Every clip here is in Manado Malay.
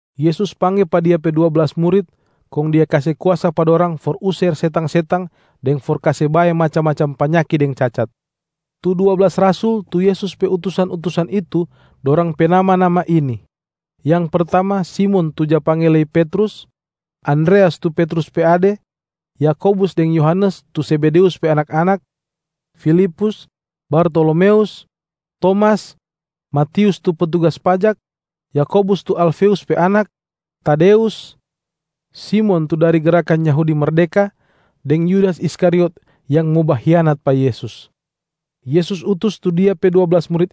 Yesus pangge pa Dia pe dua blas murit, kong Dia kase kuasa pa dorang for user setang-setang deng for kase bae macam-macam panyaki deng cacat. Tu dua blas rasul tu Yesus pe utusan-utusan itu, dorang pe nama-nama ini: yang pertama Simon tu ja pangge lei Petrus, Andreas tu Petrus pe ade, Yakobus deng Yohanes tu Zebedeus pe anak-anak, Filipus, Bartolomeus, Tomas, Matius tu petugas pajak, Yakobus tu Alfeus pe anak, Tadeus, Simon tu dari Gerakan Yahudi Merdeka, deng Yudas Iskariot yang mo bahianat pa Yesus.Yesus utus De pe dua blas murit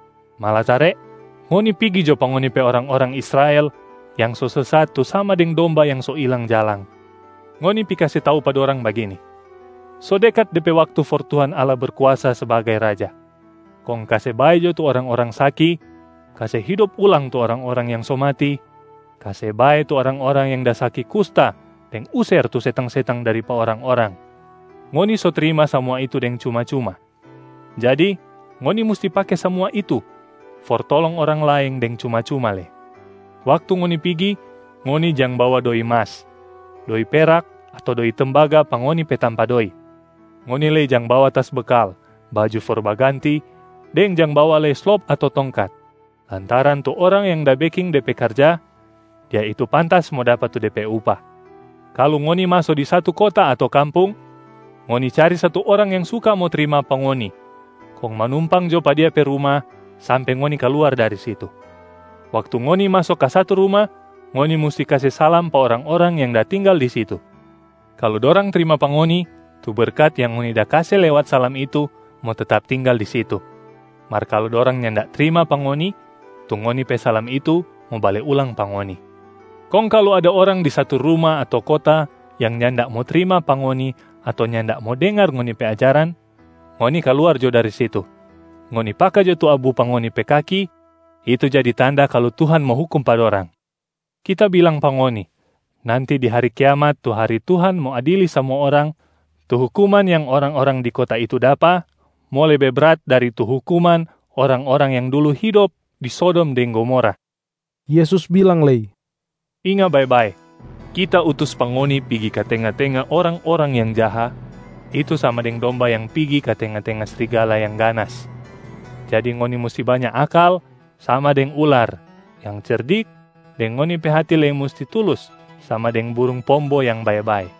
malatare ngoni pigi jo pa ngoni pe orang-orang Israel yang so sesat tu sama deng domba yang so ilang jalang. Ngoni pi kase tau pa dorang bagini, ‘So dekat de pe waktu for Tuhan Allah Berkuasa sbagai Raja.’ Kong kase bae jo tu orang-orang saki, kase hidop ulang tu orang-orang yang so mati, kase bae tu orang-orang yang da saki kusta deng user tu setang-setang dari pa orang-orang. Ngoni so trima samua itu deng cuma-cuma, jadi ngoni musti pake samua itu for tolong orang laeng deng cuma-cuma lei. Waktu ngoni pigi, ngoni jang bawa doi mas, doi perak ato doi tembaga pa ngoni pe tampa doi. Ngoni lei jang bawa tas bekal, baju for baganti, deng jang bawa lei slop ato tongkat, lantaran tu orang yang da beking de pe karja, dia itu pantas mo dapa tu de pe upah. Kalu ngoni maso di satu kota ato kampung, ngoni cari satu orang yang suka mo trima pa ngoni kong manumpang jo pa dia pe ruma sampe ngoni kaluar dari situ. Waktu ngoni maso ka satu ruma, ngoni musti kase salam pa orang-orang yang da tinggal di situ. Kalu dorang trima pa ngoni, tu berkat yang ngoni da kase lewat salam itu mo tetap tinggal di situ, mar kalu dorang nyanda trima pa ngoni, tu ngoni pe salam itu mo bale ulang pa ngoni. Kong kalu ada orang di satu ruma ato kota yang nyanda mo trima pa ngoni ato nyanda mo dengar ngoni pe ajaran, ngoni kaluar jo dari situ, ngoni paka jo tu abu pa ngoni pe kaki itu jadi tanda kalu Tuhan mo hukum pa dorang. Kita bilang pa ngoni, nanti di hari kiamat tu hari Tuhan mo adili samua orang, tu hukuman yang orang-orang di kota itu dapa mo lebe brat dari tu hukuman orang-orang yang dulu hidop di Sodom deng Gomora.” Yesus bilang lei, “Inga bae-bae, Kita utus pa ngoni pigi ka tenga-tenga orang-orang yang jaha, itu sama deng domba yang pigi ka tenga-tenga srigala yang ganas. Jadi ngoni musti banya akal sama deng ular yang cerdik deng ngoni pe hati lei musti tulus sama deng burung pombo yang bae-bae.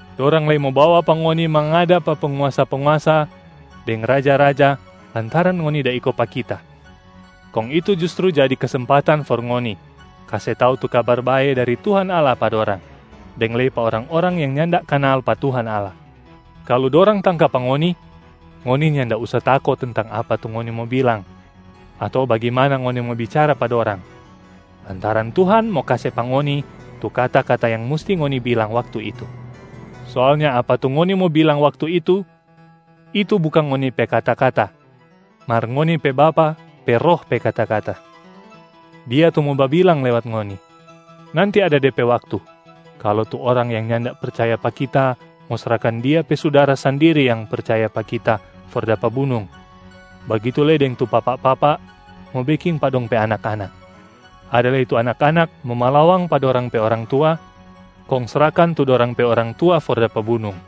Dorang lei mo bawa pa ngoni mangada pa penguasa-penguasa deng raja-raja lantaran ngoni da iko pa Kita, kong itu justru jadi kesempatan for ngoni kase tau tu Kabar Bae dari Tuhan Allah pa dorang deng lei pa orang-orang yang nyanda kanal pa Tuhan Allah. Kalu dorang tangka pa ngoni, ngoni nyanda usa tako tentang apa tu ngoni mo bilang ato bagimana ngoni mo bicara pa dorang, lantaran Tuhan mo kase pa ngoni tu kata-kata yang musti ngoni bilang waktu itu. Soalnya apa tu ngoni mo bilang waktu itu, itu bukang ngoni pe kata-kata mar ngoni pe Bapa pe Roh pe kata-kata, Dia tu mo babilang lewat ngoni. Nanti ada de pe waktu, kalu tu orang yang nyanda percaya pa Kita mo srahkan dia pe sudara sandiri yang percaya pa Kita for dapa bunung, bagitu lei deng tu papa-papa mo beking pa dong pe anak-anak. Ada lei tu anak-anak mo malawang pa dorang pe orang tua, kong srahkan tu dorang pe orang tua for dapa bunung.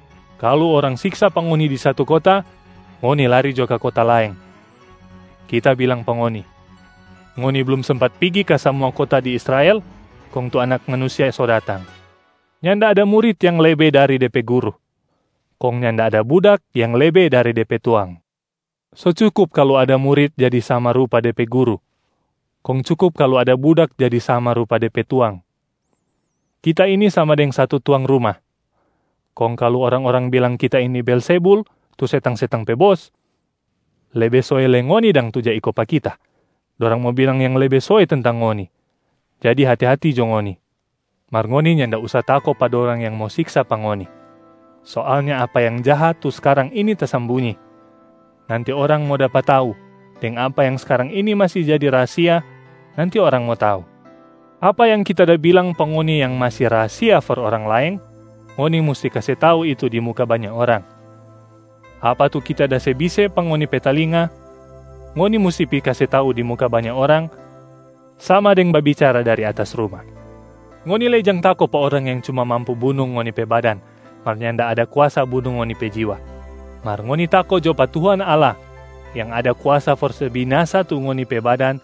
Kalu orang siksa pa ngoni di satu kota, ngoni lari jo ka kota laeng. Kita bilang pa ngoni, ngoni blum sempat pigi ka samua kota di Israel, kong tu Anak Manusia so datang. Nyanda ada murit yang lebe dari de pe guru, kong nyanda ada budak yang lebe dari de pe tuang. So cukup kalu ada murit jadi sama rupa de pe guru, kong cukup kalu ada budak jadi sama rupa de pe tuang. Kita ini sama deng satu tuang ruma, kong kalu orang-orang bilang Kita ini Beelzebul tu setang-setang pe bos, lebe soe lei ngoni dang tu ja iko pa Kita, dorang mo bilang yang lebe soe tentang ngoni. Jadi hati-hati jo ngoni. Mar ngoni nyanda usa tako pa dorang yang mo siksa pa ngoni. Soalnya apa yang jaha tu skarang ini tasambunyi, nanti orang mo dapa tau, deng apa yang skarang ini masi jadi rahasia, nanti orang mo tau. Apa yang Kita da bilang pa ngoni yang masi rahasia for orang laeng, ngoni musti kase tau itu di muka banya orang. Apa tu Kita da se bise pa ngoni pe talinga, ngoni musti pi kase tau di muka banya orang sama deng babicara dari atas ruma. Ngoni lei jang tako pa orang yang cuma mampu bunung ngoni pe badan mar nyanda ada kuasa bunung ngoni pe jiwa. Mar ngoni tako jo pa Tuhan Allah yang ada kuasa for se binasa tu ngoni pe badan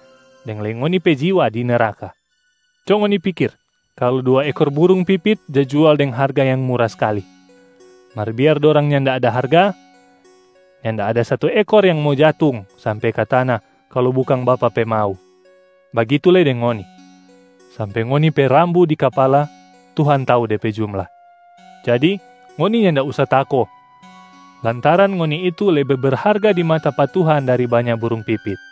deng lei ngoni pe jiwa di neraka. Co ngoni pikir kalu dua ekor burung pipit ja jual deng harga yang mura skalia. Mar biar dorang nyanda ada harga, nyanda ada satu ekor yang mo jatung sampe ka tana kalu bukang Bapa pe mau. Bagitu lei deng ngoni, sampe ngoni pe rambu di kapala Tuhan tau de pe jumla. Jadi ngoni nyanda usa tako lantaran ngoni itu lebe berharga di mata pa Tuhan dari banya burung pipit.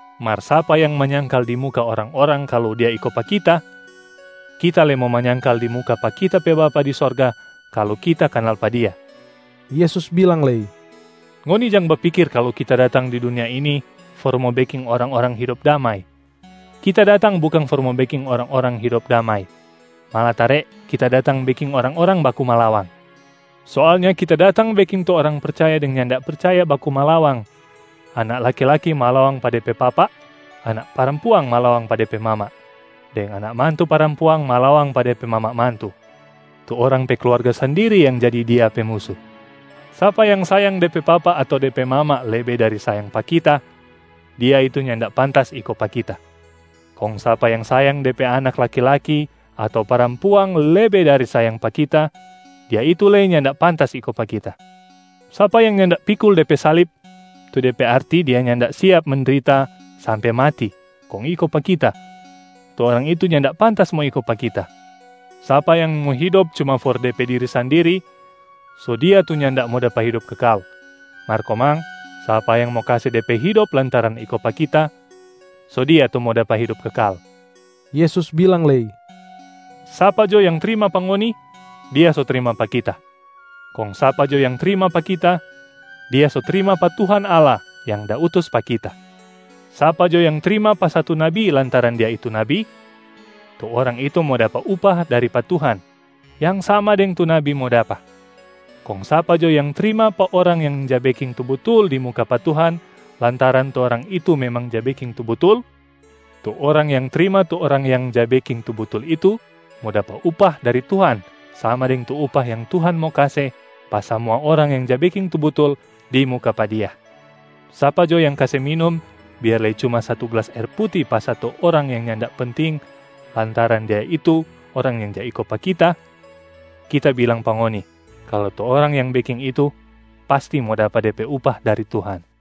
Mar sapa yang manyangkal di muka orang-orang kalu dia iko pa Kita, Kita lei mo manyangkal di muka pa Kita pe Bapa di sorga kalu Kita kanal pa dia”. Yesus bilang lei, “Ngoni jang bapikir kalu Kita datang di dunia ini for mo beking orang-orang hidop damai. Kita datang bukang for mo beking orang-orang hidop damai, malatare Kita datang beking orang-orang baku malawang. Soalnya Kita datang beking tu orang percaya deng nyanda percaya baku malawang: anak laki-laki malawang pa de pe papa, anak parampuang malawang pa de pe mama, deng anak mantu parampuang malawang pa de pe mama mantu. Tu orang pe kluarga sandiri yang jadi dia pe musu. Sapa yang sayang de pe papa ato de pe mama lebe dari sayang pa Kita, dia itu nyanda pantas iko pa Kita. Kong sapa yang sayang de pe anak laki-laki ato parampuang lebe dari sayang pa Kita, dia itu lei nyanda pantas iko pa Kita. Sapa yang nyanda pikul de pe salib, tu de pe arti dia nyanda siap mendrita sampe mati kong iko pa Kita, tu orang itu nyanda pantas mo iko pa Kita. Sapa yang mo hidop cuma for de pe diri sandiri, so dia tu nyanda mo dapa hidop kekal. Mar komang, sapa yang mo kase de pe hidop lantaran iko pa Kita, so dia tu mo dapa hidop kekal.” Yesus bilang lei, “Sapa jo yang trima pa ngoni, dia so trima pa Kita. Kong sapa jo yang trima pa Kita, dia so trima pa Tuhan Allah yang da utus pa Kita. Sapa jo yang trima pa satu nabi lantaran dia itu nabi, tu orang itu mo dapa upah dari pa Tuhan yang sama deng tu nabi mo dapa. Kong sapa jo yang trima pa orang yang ja beking tu butul di muka pa Tuhan lantaran tu orang itu memang ja beking tu butul, tu orang yang trima tu orang yang ja beking tu butul itu mo dapa upah dari Tuhan sama deng tu upah yang Tuhan mo kase pa samua orang yang ja beking tu butul di muka pa Dia. Sapa jo yang kase minum, biar lei cuma satu glas aer puti pa satu orang yang nyanda penting lantaran dia itu orang yang ja iko pa Kita, Kita bilang pa ngoni kalu tu orang yang beking itu pasti mo dapa de pe upah dari Tuhan.”